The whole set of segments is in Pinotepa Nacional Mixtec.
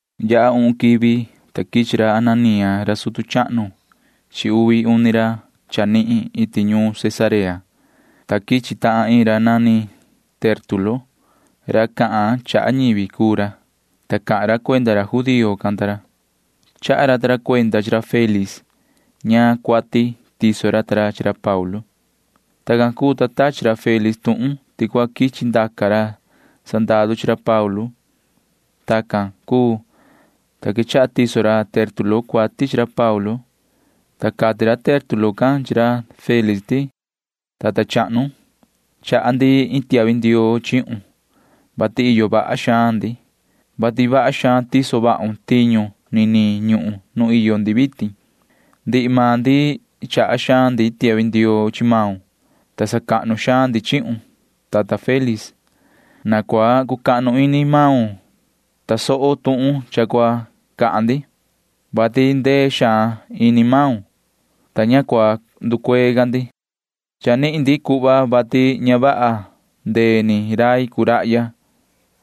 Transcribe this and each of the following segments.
Yaha uhun quivi, ta quichi ra Ananía ra sutu chahnu chi uvi uni ra chanihin iti ñuun Cesarea, ta quichi tahan iin ra nani Tértulo. Ra cahan chaha ñivi cuu ra, ta cahan ra cuenda ra judío can ta ra. Chaha ra ta ra cuenda chi ra Félix ñaan cuati tiso ra ta ra chi ra Paulu. Tacan cuu, ta tachi ra Félix tuhun ti cua quichi ndaca ra sandaru chi ra Paulu. Tacan cuu, ta quechaha tiso ra Tértulo cuati chi ra Paulu, ta cati ra Tértulo can chi ra Félix ti: ―Yoho tata chahnu, chaha ndi iin tiahvi ndioo chihun, vati iyo vaha xaan ndi. Chito vaha xaun, vati vaha xaan tiso vahun tiñu niniin ñuhun nu iyo ndi vitin. Ndihi maan ndi chaha xaan ndi tiahvi ndioo chi maun, ta sacahnu xaan ndi chihun, tata Félix. Na cua cucahnu ini maun tasohun tuhun cha cua cahan ndi, vati ndee xaan ini maun, ta ña cua nducuee ca ndi. Cha nihin ndi cuhva, vati ña vaha ndee ni rai cuu rahya.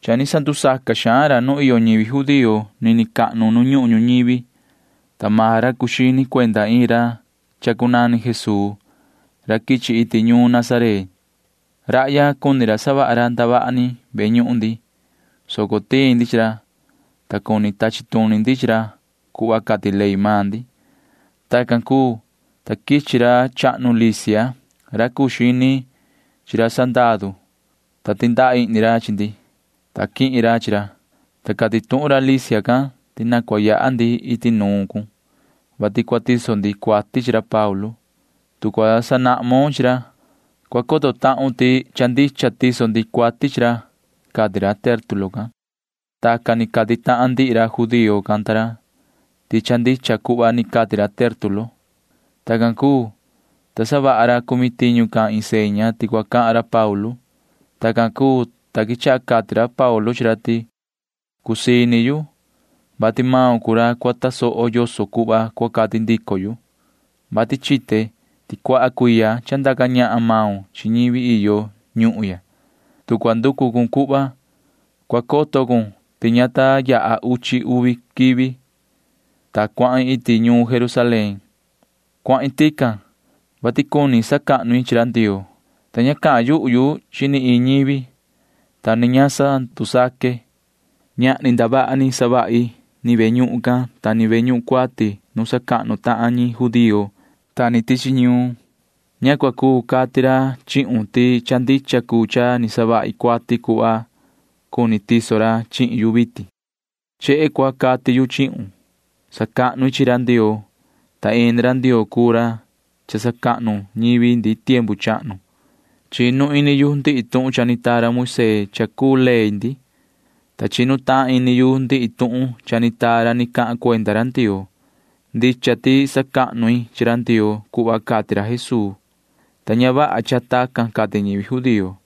Cha ni sandusaca xaan ra nu iyo ñivi judío nini cahnu nu ñuhun ñuñivi, ta maan ra cuu xini cuenda iin ra chacunani Jesuu ra quichi iti ñuun Nazaret. Rahya cuni ra savaha ra ndavaha ni ve ñuhun cahnu ndi, soco tiin ndi chi ra, ta cuni tachi tuni ndi chi ra cuhva cati ley maan ndi. Tacan cuu, ta quichi ra chahnu Lisia ra cuu xini ra sandaru, ta tindaha ihni ra chi ndi, ta quihin ra chi ra, ta cati tuhun ra Lisia can ti na cua yaha ndi iti nuun cun, vati cua tiso ndi cuati chi ra Paulu. Tu cua sanahmon chi ra, cua coto tahun ti cha ndicha tiso ndi cuati chi ra ―cati ra Tértulo can. Tacan ni cati tahan ndihi ra judío can ta ra ti cha ndicha cuhva ni cati ra Tértulo. Tacan cuu, ta savaha ra cumi tiñu can iin seña ti cua cahan ra Paulu. Tacan cuu, ta quechaha cati ra Paulu chi ra ti: ―Cusii ini yu, vati maun cuu ra cua tasoho yoso cuhva cua cati ndico yu, vati chite ti cuaha cuiya cha ndaca ñahan maun chi ñivi iyo ñuhun ya. Tu cua nducu cun cuhva, cua coto cun ti ña ta queta uchi uvi quivi, ta cuahin iti ñuun Jerusalén. Cuahin tican, vati cuni sacahnu i chi ra Ndioo, ta ña cahan yuhu yu chi ni iin ñivi, ta ni ña sandusaque. Ñahni ndavaha ni savahi ni ve ñuhun cahnu can ta ni ve ñuhun cuati nu sacahnu tahan ñi judío ta ni tichi ñuun. Ña cua cuu cati ra chihun ti cha ndicha cuu cha ni savahi cuati cuhva cuni tiso ra chihin yu vitin. Chehe cua cati yu chihun. Sacahnu i chi ra Ndioo, ta ini ra Ndioo cuu ra cha sacahnu ñivi ndi tiempu chahnu. Chinu ini yu ndihi tuhun cha ni taa ra Moisee cha cuu ley ndi, ta chinu tahan ini yu ndihi tuhun cha ni taa ra ni cahan cuenda ra Ndioo. Ndicha ti sacahnu i chi ra Ndioo cuhva cati ra Jesuu, ta ña vaha cha tacan cati ñivi judío.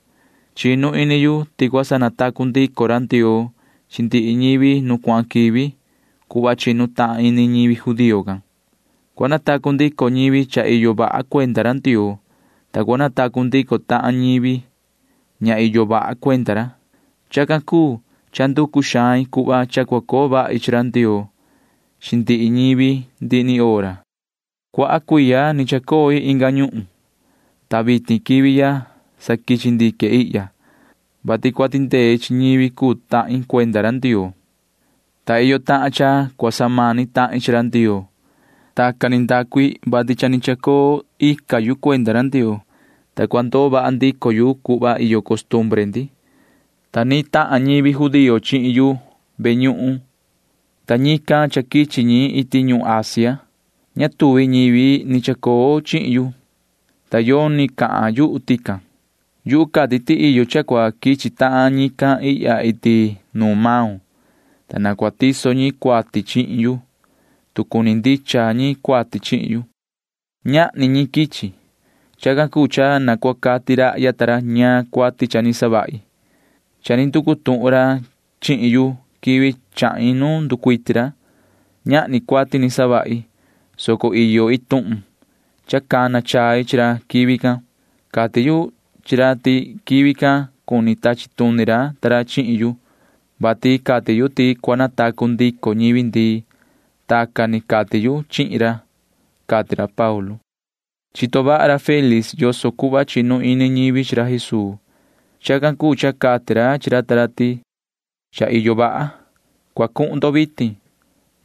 Chinu ini yu ti cua sanatacu ndico ra Ndioo chi ndihi ñivi nu cuahan quivi cuhva chinu tahan ini ñivi judío can. Cua natacu ndico ñivi cha iyo vaha cuenda ra Ndioo, ta cua natacu ndico tahan ñivi ña iyo vaha cuenda ra. Chacan cuu cha nducu xain cuhva cha cua coo vahi chi ra Ndioo chi ndihi ñivi ndihi ni hora. ’Cuaha cuiya ni chacoi inga ñuhun, ta vitin quivi ya sa quichi ndique ihya, vati cua tindei chi ñivi cuu tahin cuenda ra Ndioo, ta iyo tahan cha cua samani tahin chi ra Ndioo. Tacan ni ndacu i, vati cha ni chacoo ica yu cuenda ra Ndioo, ta cua ndoo vaha ndico yu cuhva iyo costumbre ndi, ta ni tahan ñivi judío chihin yu ve ñuhun, ta ñican cha quichi ñi iti ñuhun Asia. Ña tuvi ñivi ni chacoo chihin yu, ta yoni cahan yuhu tican. Yu cati ti iyo cha cua quichi tahan ñican ihya iti nuun maun, ta na cua tiso ñi cuati chihin yu, tu cuni ndicha ñi cuati chihin yu. Ñahni ñi quichi. Chacan cuu cha na cua cati rahya ta ra ñaan cuati cha ni savahi. Cha ni nducu tuhun ra chihin yu quivi chahin nu nducuiti ra. Ñahni cuati ni savahi, soco iyo iin tuhun cha cana chai chi ra quivi can. Cati yu chi ra ti quivi can cuni tachi tuni ra ta ra chihin yu, vati cati yu ti cua natacu ndico ñivi ndii. Tacan ni cati yu chihin ra ―cati ra Paulu. Chito vaha ra Félix yoso cuhva chinu ini ñivi chi ra Jesuu. Chacan cuu cha cati ra chi ra ta ra ti: ―Cha iyo vaha. Cua cuhun ndo vitin.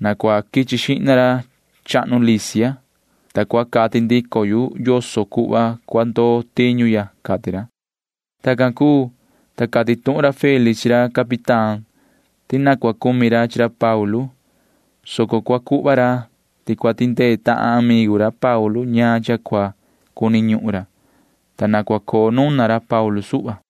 Na cua quichi xihna ra chahnu Lisia, ta cua cati ndico yu yoso cuhva cua ndoo tiñu ya ―cati ra. Tacan cuu, ta cati tuhun ra Félix chi ra capitán ti ni cua cumi ra chi ra Paulu, soco cua cuhva ra ti cua tindee tahan amigu ra Paulu ñaan cha cua cuni ñuhun ra, ta na cua coo nuna ra Paulu suhva.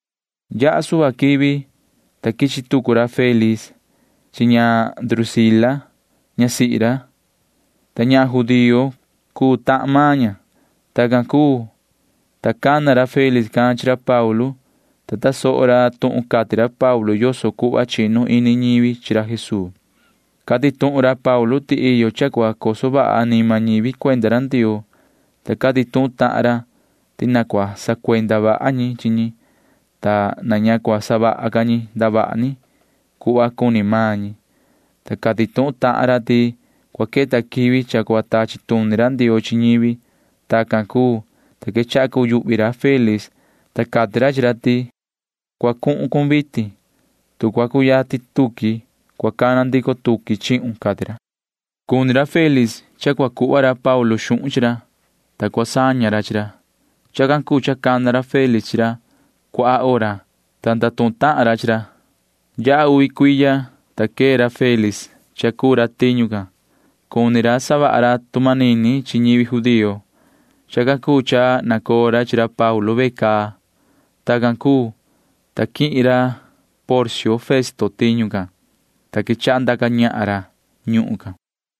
Yaha suhva quivi, ta quichi tucu ra Félix chi ña Drusila ñasihi ra, ta ñahan judío cuu tahan maan ña. Tacan cuu, ta cana ra Félix can chi ra Paulu, ta tasoho ra tuhun cati ra Paulu yoso cuhva chinu ini ñivi chi ra Jesuu. Cati tuhun ra Paulu ti iyo cha cua coso vaha anima ñivi cuenda ra Ndioo, ta cati tuhun tahan ra ti na cua sacuenda vaha ñi chi ñi, ta na ña cua savaha ca ñi ndavaha ni cuhva cuni maan ñi, ta cati tuhun tahan ra ti cua queta quivi cha cua tachi tuni ra Ndioo chi ñivi. Tacan cuu, ta quechaha cuyuhvi ra Félix, ta cati ra chi ra ti: ―Cua cuhun cun vitin. Tu cua cuyatin tuqui, cua cana ndico tuqui chihun ―cati ra. Cuni ra Félix cha cua cuhva ra Paulu xuhun chi ra, ta cua saña ra chi ra. Chacan cuu cha cana ra Félix chi ra cuaha hora, ta ndatuhun tahan ra chi ra. Yaha uvi cuiya, ta quee ra Félix cha cuu ra tiñu can. Cuni ra savaha ra tu manini chi ñivi judío. Chacan cuu cha nacoo ra chi ra Paulu ve caa. Tacan cuu, ta quihin ra Porcio Festo tiñu can, ta quechaha ndaca ñahan ra ñuhun can.